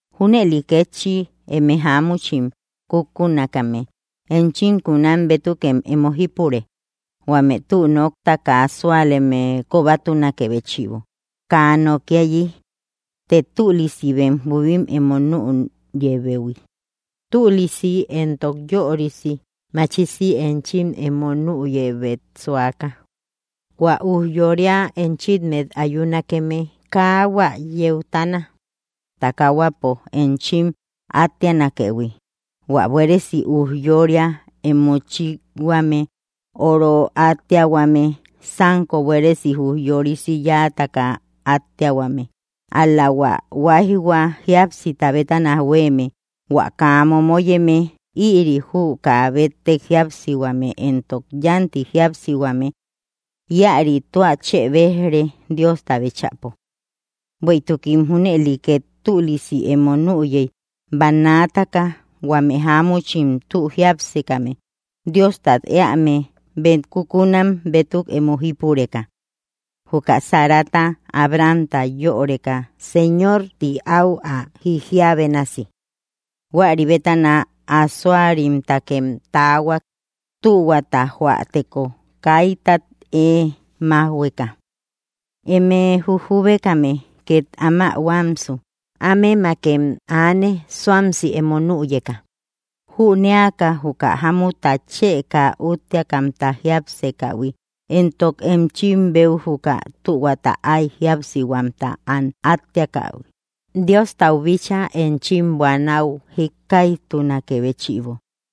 Júnëli kétchi eme jáamuchim kukunakame, enchim kunam bétukem emo jípure, huame tü nokta kaa súaleme kobatunakë béchïbo kaa nokiayi, të tülisi bem jubim emo nüyëubeyi, tülisi éntok yörisi machisi enchim emo nüyëubet suaka. Huä ujyória enchimmet ayunakeme kaa hua yeutana takahuapo enchim átteanakëhui, hua buéresi ujyória emo chíkhuame, óoro átteahuame, sánko buéresi ujyorisi yáataka átteahuame, ál‑la hua huáijhua jíapsita bétana huéeme, hua kaa momoyeme, ïri jü kaa béttek jíapsihuame éntok yánti jíapsihuame; ïari tua chë béj‑re Diosta bíchäpo. Bueïtukim junëli két tülisi emo nüyey bannaataka huame jáamuchim tü jiápsekame, Diostat éame, bem kukunam bétuk emo jípureka; juka Sarata Abrahamta “yöreka Señor ti áu ä jijiä bénasi”. Huäri bétana asoarimtakem taahuak, tühuata jóäteko, kaitat ée májhueka. Eme jujubekame, két áma huamsu, ámemakem aane suamsi emo nüyeka, jünéaka juka jámutta chë kaa útteakamta jiápsekähui, éntok enchim beu juka tühuauta ay jíapsihuamta am átteakähi, Diostau bíchaa enchim buanäu jíkkaijtunakë béchïbo.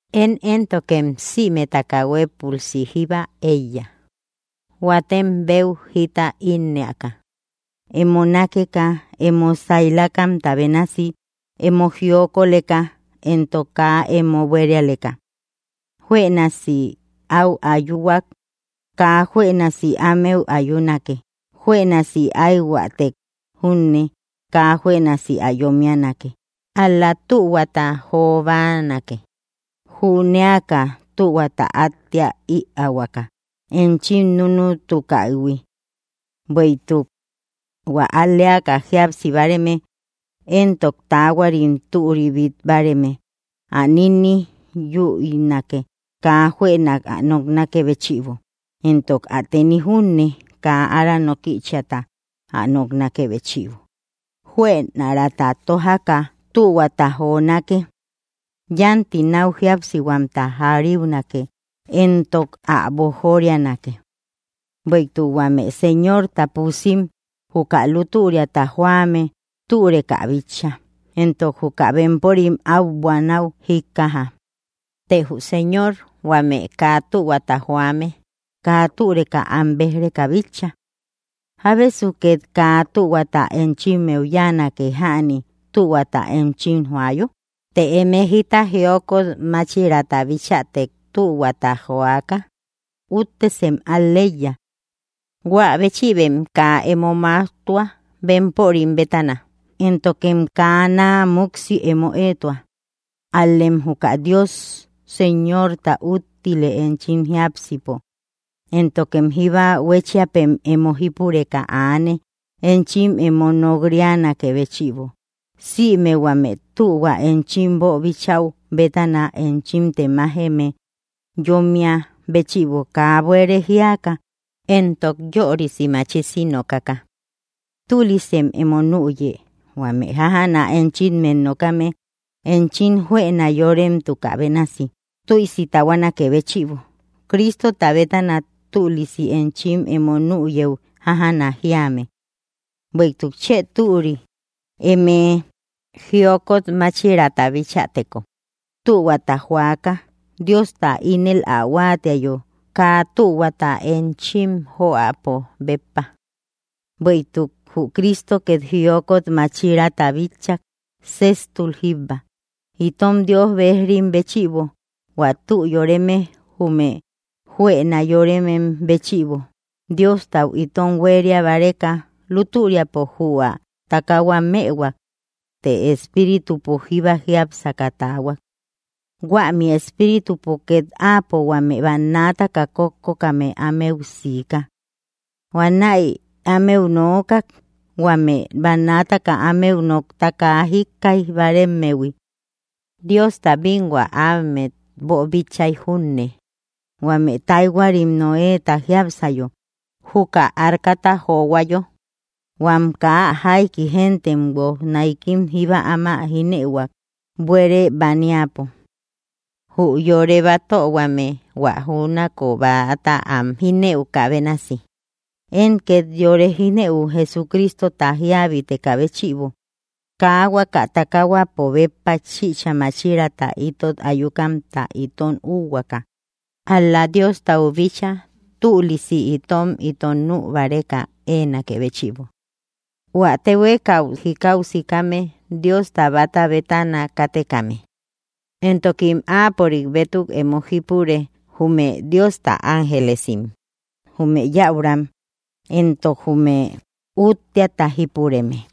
Én éntokem sïmetaka huépülsi jíba éiya, huatem béu jita ínnëaka, emo nákeka emo sailakamta bénasi, emo jiokoleka, éntok kaa emo buérialeka. Juënasi áu ayuhuak kaa juënasi ámeu ayunake, juënasi aïhuätek júnne kaa juënasi ä yómmianake, ál‑la tühuata jo báanake, jünéaka tühuata átteä ïaahuaka enchim núnutukähui. Bueïtuk: Huä al‑leaka jíapsi báareme, éntok taahuarim türi bít báareme, ä nínni yüinake kaa juënak ä noknakë béchïbo, éntok ä teni júne kaa ára nókïchiata ä noknakë béchïbo; juënarata tójaka tühuata jonake; yánti náu jíapsihuamta jariunake éntok ä boojorianake. Bueïtuk huame Señorta pusim juka lútüriata joame türeka bitcha, éntok juka bempörim áu buanäu jíkkaja; tee jü Señor huame kaa tühuata joame kaa türeka am béj‑reka bitcha. ¿Jábesu két kaa tühuata enchimmeu yáanake jäni tühuata enchim joayo? Të eme jita jiokot máchiraata bichätek tühuata joaka, úttesem al‑leiya. Huä béchïbem kaa emo máujtua bempörim bétana, éntokem kaa naa múksi emo éetua, ál‑lem juka Dios Señorta úttile enchim jiápsipo, éntokem jíba huechiapem emo jípureka aane enchim emo nok‑ríanakë béchïbo, sïme huame tühua enchim boobichäu bétana enchim temájeme yómmia béchïbo kaa buere jíaka éntok yörisi machisi nokaka. Tülisem emo nüye huame jájana enchimmet nokame, enchim juëna yorememtukä bénasi, tiusi tahuanaké béchïbo, Cristota bétana tülisi enchim emo nüyëu jájana jíame. Bueïtuk chë türi emé jiokot máchiraata bichäteko tühuata joaka, Diosta ínel ä huáatiayo, kaa tühuata enchim joäpo béppa. Bueïtuk jü Cristo két jiokot máchiraata bitchak séjtul jíbba, itom Dios bejrim béchïbo, hua tü yóreme jume juëna yóremem béchïbo, Diostau itom huéria báreka, lútüriapo jü ä takahua mëhuak, të espíritupo jíba jiápsaka taahuak. Huämi espíritupo két áapo huame bannaataka kókkokame anëu siika. Huanäi ámeu nookak, huame bannaataka ámeu nokta kaa jíkkaij báaremmehui, Diosta bínhua ámet boobíchaïhuiy junne, huame taahuarim Noéta jiápsayo, juka arcata johuayo, huam kaa jaiki géntem, guoj náikim jíba áma jíneïhuak, buere baniapo. Jü yore batöhuame hua júnako bäata am jínëukä bénasi, én két yore jínëu Jesucristota jíabitekä béchïbo, kaa huaka takahuapo béppa chïcha máchiraata itot ayukamta itom úhuaaka; ál‑la Diostau bíchaa tülisi itom ito nü báreka éenakë béchïbo. Huä téhuekau jikau sikame Diosta báta bétana kátekame; éntokim áapörik bétuk emo jípure jume Diosta ángelesim, jume yäuram, éntok jume útteata jípureme.